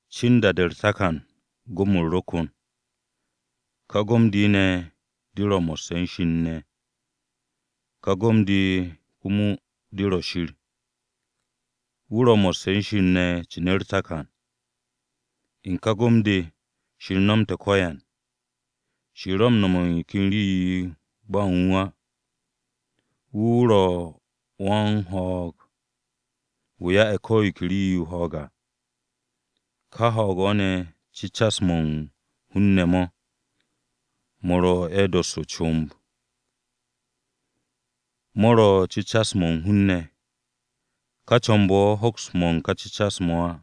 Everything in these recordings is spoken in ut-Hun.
Cin da-de u̱r-takan Gom-u̱r ro kon. Ka Gom-de ne̱ de ro mo̱sse̱ u̱n Shir ne̱. Ka Gom-de komo de ro̱ Shir. Wu̱ ro̱ mo̱sse̱ u̱n Shir ne̱ cin u̱r-takan. U̱n ka Gom-de, Shir nomte̱ ko̱yan. Shir ro̱ u̱n no̱m yo ken rii-yo ba u̱n wu̱ á. Wu̱ wu̱ ro̱ wan-ho̱o̱g, wu̱ ya'e̱ ko̱ yo ke rii-yo ho̱o̱g à. Ka ho̱o̱g-o̱ ne̱, cecas-mo̱ u̱n hun-ne̱ mo̱. Mo̱ ro̱ ye̱ m-dosse̱ o-comb. Mo̱ ro̱ cecas-mo̱ u̱n hun-ne̱. Ká comb-o̱ hoks mo̱ u̱n ká cecas-mo̱ á.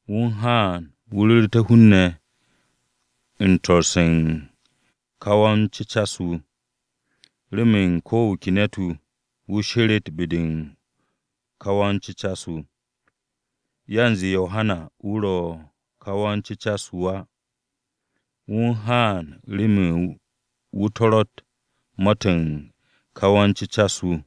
Wu̱ u̱n haan wu̱ ru̱ru̱té̱ hun-ne̱ u̱n su̱'e̱ u̱n ká wa-m-cecas-wu̱, remen ko̱ wu̱ ke ne̱t-wu̱, wu̱ sheret be-de u̱n ka wa-m-cecas-wu̱. Yanze Yohana wu̱ ro̱ ka wa-m-cecas-wu̱ á. Wu̱ u̱n haan remen wu̱ su̱u̱te̱ ma-to̱ u̱n ka wa-m-cecas-wu̱.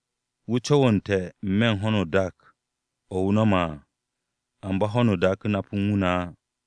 Wu̱ co̱wo̱nte̱ n-me̱ u̱n ho̱no o-dak o̱ wu̱ no̱me̱ à, amba ho̱n dak u̱n nap u̱n wu̱ ne̱ á.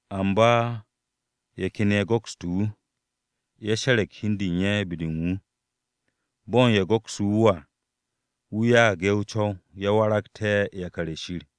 Amba ye̱ ken ye̱ go̱kste̱ wu̱. Ye̱ she̱re̱g hi u̱n de u̱n ye̱ be-de u̱n wu̱. Bo̱n ye̱ go̱kse̱ wu̱ à, wu̱ ya'ag ye̱ o-co̱w, ye̱ waragté̱ yakar-ye̱ Shir.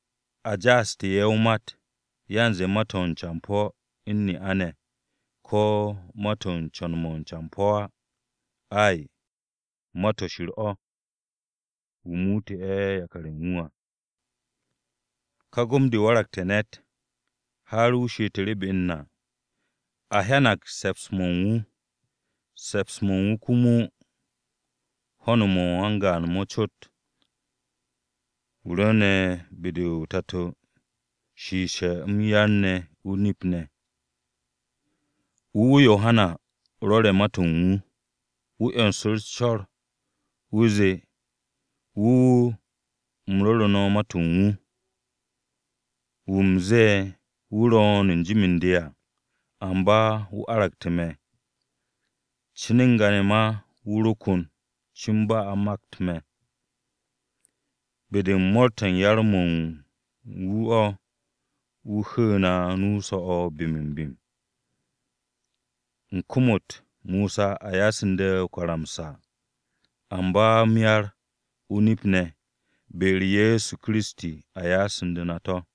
A ja'aste̱ ye̱ m-mat. Yanze mat-o̱ u̱n campo̱ u̱n ne'a-ne̱, ko̱ mat-o̱ u̱n co̱n-mo̱ u̱n campo̱ á. Ay, mat-o̱ u̱n Shir o̱, wu̱ muute̱ ye̱ yakar-ye̱ u̱n wu̱ à. Ka Gom-de waragte̱ ne̱t har wu̱ she'etu̱ru̱ be u̱n na. A hyanag se̱ps-mo̱ u̱n wu̱, se̱ps-mo̱ u̱n wu̱ komo u̱n ho̱n mo̱ wan-gaan mo̱ cot, wu̱ rwu̱u̱ne̱ be-de o-Tato shiishe̱ m-yar o-nip ne̱ à. Wu̱ wu̱ Yohana rwo̱re̱ ma-to̱ u̱n wu̱. Wu̱ 'yonsu̱ru̱ u̱s-co̱r. Wu̱ zee, “Wu̱ wu̱ u̱m ru̱ru̱ no̱ ma-to̱ u̱n wu̱, wu̱ u̱m ze̱e̱, ‘Wu̱ ro̱o̱n n-jim u̱n de à, amba wu̱ aragte̱ me̱. Cin n-ga ne̱ ma wu̱ ro kon, cin ba a u̱n makt me̱.’” Be-de u̱n mo̱o̱r-to̱ u̱n yar-mo̱ u̱n wu̱ o̱ wu̱ hu̱u̱ na nu-o so̱-o̱ bim-o-bim. U̱n kom-u̱t Mosa a ya'asu̱nde̱ o-karamsa, amba m-yar o-nip ne̱, be-u̱r Ye̱so Kiristi a ya'asu̱nde̱ na mo̱.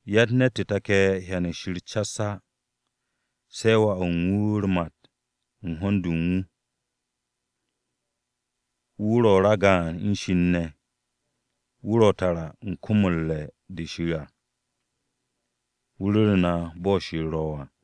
Yatt ne̱t-wu̱ take̱ hyan u̱n Shir cas á, se̱ Wà u̱n wu̱ u̱r-mat u̱n ho̱n-de u̱n wu̱. Wu̱ ro̱ ragaan u̱n Shir ne̱. Wu̱ ro̱ tara u̱n kom-o̱ u̱r-re̱ de Shir à, wu̱ ru̱ru̱ na bo̱ Shir ro̱ à.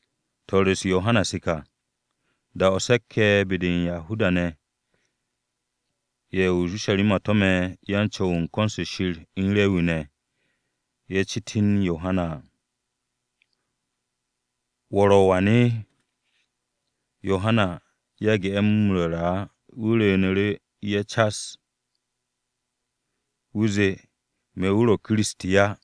Swo̱-u̱s Yohana se ka, da-o̱ se̱k-ye̱ be-de u̱n Yahuda-ne̱, ye̱ o-Urusharima to̱me̱ yan-Co̱w u̱n ko̱n-se Shir u̱n Rewi-ne̱ ne̱ à. Ye̱ he ye̱ cit u̱n Yohana, “¿Wo̱ ro̱ wan?” Yohana yage̱ ye̱ m-ru̱ru̱ á. Wu̱ rwu̱u̱ne̱ ye̱ cas, wu̱ zee, “Me̱ wu̱ ro̱ Kiristi á.”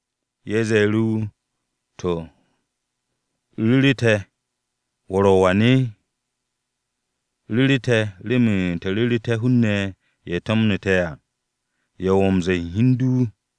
Ye̱ ze̱e̱ru̱ wu̱, “To̱, ¿ru̱ru̱ te̱ wo̱ ro̱ wa ne̱? Ru̱ru̱ te̱ remen te̱ ru̱ru̱té̱ hun-ne̱ ye̱ to̱mne̱ te̱ à, ¿ya wo̱ m-ze̱e̱ u̱n hi u̱n du?”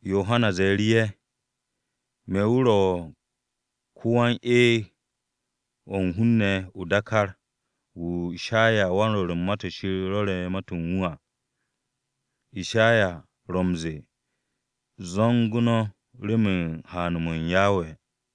Yohana ze̱e̱ru̱ ye̱, “Me̱ wu̱ ro̱ ko-wan-eeg o̱ u̱n hun-ne̱ o-dákár, wu̱ Ishayawan-Rwo̱r u̱n Ma-to̱ Shir rwo̱re̱ ma-to̱ u̱n wu̱ à. Ishaya ro̱ m-ze̱e̱, ‘Zo̱ngu̱ no̱ remen haan-m Yawe.’”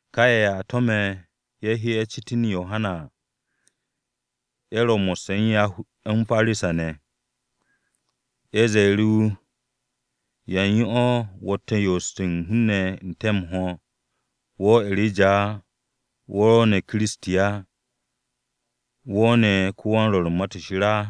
Ka ye̱ a to̱me̱ ye̱ he, ye̱ cit u̱n Yohana à, ye̱ ro̱ mo̱sse̱ u̱n Parisa-ne̱ ne̱. Ye̱ ze̱e̱ru̱ wu̱, “¿Yan yo wo̱tte̱ u̱n yo'os u̱n hun-ne̱ n-te̱ m-ho̱, wo̱ E̱reja á, wo̱ ro̱ ne̱ Kiristi á, ¿wo̱ ne̱ ko-wan-rwo̱r u̱n Ma-to̱ Shir á?”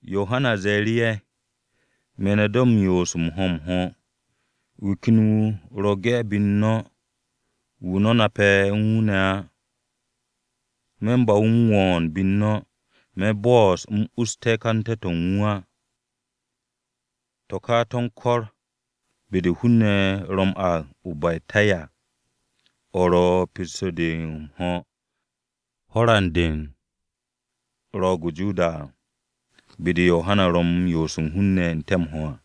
Yohana ze̱e̱ru̱ ye̱, “Me̱ no̱ de̱ m-yo'os m-ho̱ m-ho̱. Wu̱ ken ro̱ ge̱ be u̱n no̱, wu̱ no̱ nape̱ u̱n wu̱ ne̱ á. Me̱ u̱n ba wu̱ m-wo̱o̱n be u̱n no̱. Me̱ bo'os u̱m us ka'ante̱-to̱ u̱n wu̱ á.” To̱ ka to̱ u̱n ko̱r u̱n be-de hun-ne̱ ro̱ m-aag o-Betanya, o̱ ro̱ pesto-de so̱ u̱n ho̱ran-de u̱n Ro̱o̱g-o̱ o-Joda à, be-de Yohana ro u̱n yo'os u̱n hun-ne̱ n-te̱ m-ho̱ à.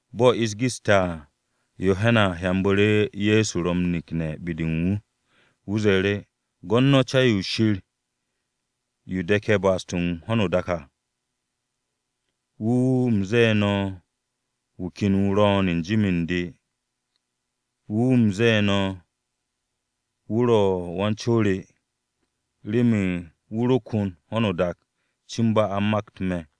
Bo̱ ish geste̱ à, Yohana hyanbu̱ru̱ Ye̱so ro̱ m-nekne̱ be-de u̱n wu̱. Wu̱ ze̱e̱ru̱, “Gwo̱t no̱ Ca-yo Shir yo de̱ke̱ ba'as-to̱ u̱n ho̱no o-dak à! Wu̱ wu̱ u̱m ze̱e̱ no̱ wu̱ ken wu̱ ro̱o̱n n-jim u̱n de. Wu̱ u̱m ze̱e̱ no̱ wu̱ ro̱ Wan-co re à, remen wu̱ ro kon ho̱no o-dak cin ba a ro makt me̱.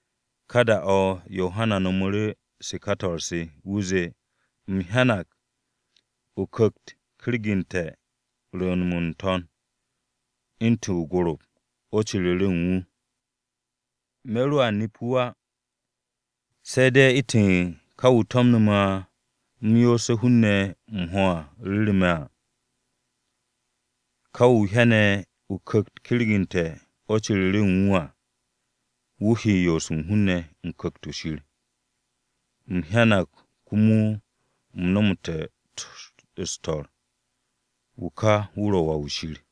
Ka da-o̱ Yohana no̱mu̱ se ka swo̱-se, wu̱ zee: “U̱m hyanag o-Ku̱kt m-kergu̱nde̱ rwu̱u̱n-mo̱ n-to̱n u̱ntu̱n o-gorop o̱ ciru̱ru̱ u̱n wu̱. Me̱ roa nep wu̱ á, se̱ de̱ u̱ntu̱ ka wu̱ to̱mnu̱ me̱ u̱m yo'os hun-ne̱ m-ho̱ ru̱ru̱ me̱ à, ‘Ka wu̱ o hyane̱ Ku̱kt-o kergu̱nte̱ o̱ ciru̱ru̱ u̱n wu̱ à, wu̱ he yo'os u̱n hun-ne̱ u̱n Ku̱kt-o̱ Shir.’ U̱m hyanag komo u̱m nomoste̱ su̱u̱te̱, wu̱ ka wu̱ ro̱ Wà-wu̱ Shir.”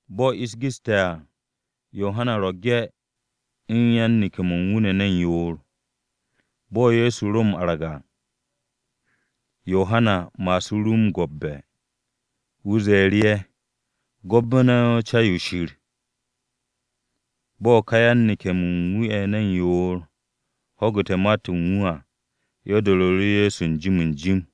Bo̱ ish geste̱ à, Yohana ro̱ ge̱ u̱n yan-neke̱-mo̱ u̱n wu̱ ne̱ ne̱n yoor. Bo̱ Ye̱so ro m-arag à, Yohana ma'asu̱ru̱ wu̱ m-gwo̱tbe̱. Wu̱ ze̱e̱ru̱ ye̱, “Gwo̱tbe̱ no̱ Ca-yo Shir!” Bo̱ ka yan-neke̱-mo̱ u̱n wu̱ ne̱ ne̱n yoor, ho̱gu̱te̱ ma-to̱ u̱n wu̱ à, ye̱ do̱ru̱ru̱ Ye̱so n-jim n-jim.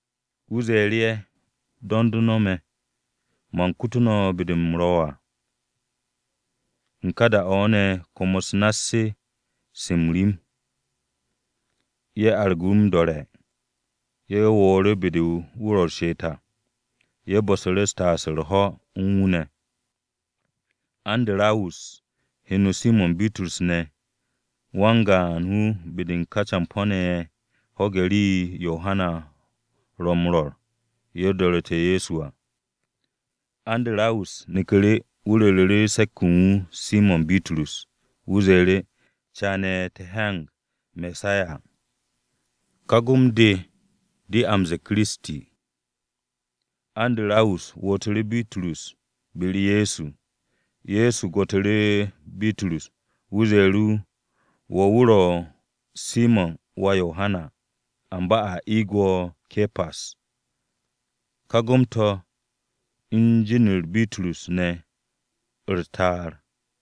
Wu̱ ze̱e̱ru̱ ye̱, “Do̱nd no̱ me̱. Man kute̱ no̱ be-de u̱m ro̱ à.” U̱n ká da-o̱ ne̱ kwo̱m-u̱s nass-se se m-rim, ye̱ argu̱ wu̱ m-do̱re̱, ye̱ wo̱o̱ru̱ be-de wu̱ ro u̱r-she'et à. Ye̱ bu̱su̱ru̱ taas u̱r-ho̱ u̱n wu̱ ne̱. Andarawus, heno Simo̱n Bitrus ne̱, wan-gaan-wu̱ be-de u̱n ká campo̱-ne̱ ye̱ ho̱ge̱ rii-yo Yohana ro m-rwo̱r ye̱, do̱ru̱te̱ Ye̱so à. Andarawus neku̱ru̱, wu̱ ru̱ru̱ se̱k-wu̱ u̱n wu̱ Simo̱n Bitrus. Wu̱ zee, “Caane̱, te̱ hyanag Mesaya,” (Ka gom-de, de a m-ze̱e̱ Kiristi). Andarawus wootu̱ru̱ Bitrus be-u̱r Ye̱so. Ye̱so gwo̱tu̱ru̱ Bitrus, wu̱ ze̱e̱ru̱ wu̱, “Wo̱ wu̱ ro̱ Simo̱n wà Yohana, amba a eeg wo̱ Ke̱pas.” (Gaan-to̱ u̱n jin-u̱r Bitrus ne̱ u̱r-Ta'ar.)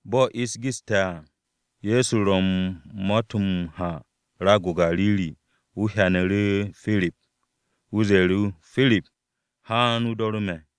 Bo̱ ish geste̱ à, Ye̱so ro u̱n ma-to̱ m-ha raag-o̱ o-Gariri. Wu̱ hyanu̱ru̱ Pirip, wu̱ ze̱e̱ru̱ Pirip, “Haan, o do̱ru̱ me̱.”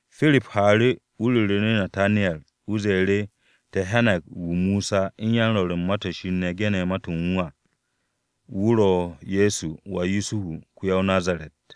Pirip haaru̱ ru̱re̱ u̱n Nataniyar. Wu̱ ze̱e̱ru̱, “Te̱ hyanag wu̱, wu̱ Mosa u̱n yan-Rwo̱r u̱n Ma-to̱ Shir ne̱ ge̱ne̱ ma-to̱ u̱n wu̱ à. Wu̱ ro̱ Ye̱so wà Yusuhu, ko-ya-o-Nazaret.”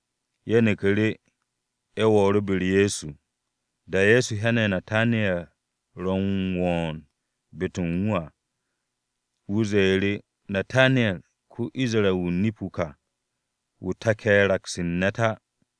Ye̱ neknu̱ru̱. Ye̱ wo̱o̱nu̱ru̱ be-u̱r Ye̱so. Da-o̱ Ye̱so hyane̱ Nataniyar ro̱ m-wo̱o̱n be-de u̱n wu̱ à, wu̱ ze̱e̱ru̱, “Nataniyar, ko-Isra-wu̱ o-nip wu̱ ka, wú̱ take̱ raks u̱n ne̱t á.”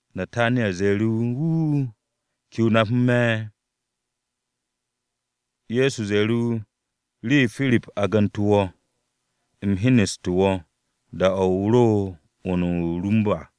Nataniyar ze̱e̱ru̱ wu̱, “Wuuu, ¿kene̱ o nape̱ me̱?” Ye̱so ze̱e̱ru̱ wu̱, “Rii-yo Pirip agante̱ wo̱, u̱m hyeneste̱ wo̱, da-o̱ o ro u̱n 'wu̱n-de o-rum à.”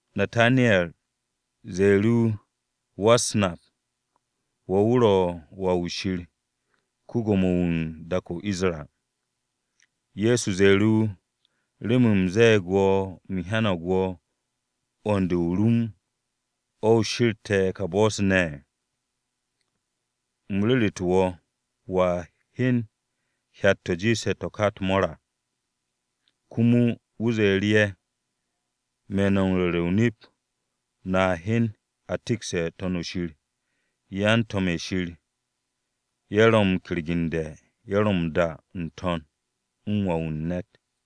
Nataniyar ze̱e̱ru̱ wu̱, “Wa-u̱s-Nap, wo̱ wu̱ ro̱ Wà-wu̱ Shir, ko-Gwo̱mo-wu̱ u̱n dak-o̱ o-Isra.” Ye̱so ze̱e̱ru̱ wu̱, “¿Remen u̱m ze̱e̱g u̱m hyanag wo̱ u̱n 'wu̱n-de o-rum, o̱ o she̱rte̱ ka bo̱-se ne̱? U̱m ru̱ru̱te̱ wo̱ wo̱a hyen hyat-to̱ jiishe̱ to̱ ka u̱t-mo̱o̱r à.” Komo wu̱ ze̱e̱ru̱ ye̱, “Me̱ no̱ m-ru̱re̱ o-nip, no̱a hyen a tikste̱ To̱n-o̱ Shir, yan-to̱m-ye̱ Shir ye̱ ro̱ m-kergende̱, ye̱ ro̱ m-da n-to̱n u̱n Wà-wu̱ u̱n ne̱t.”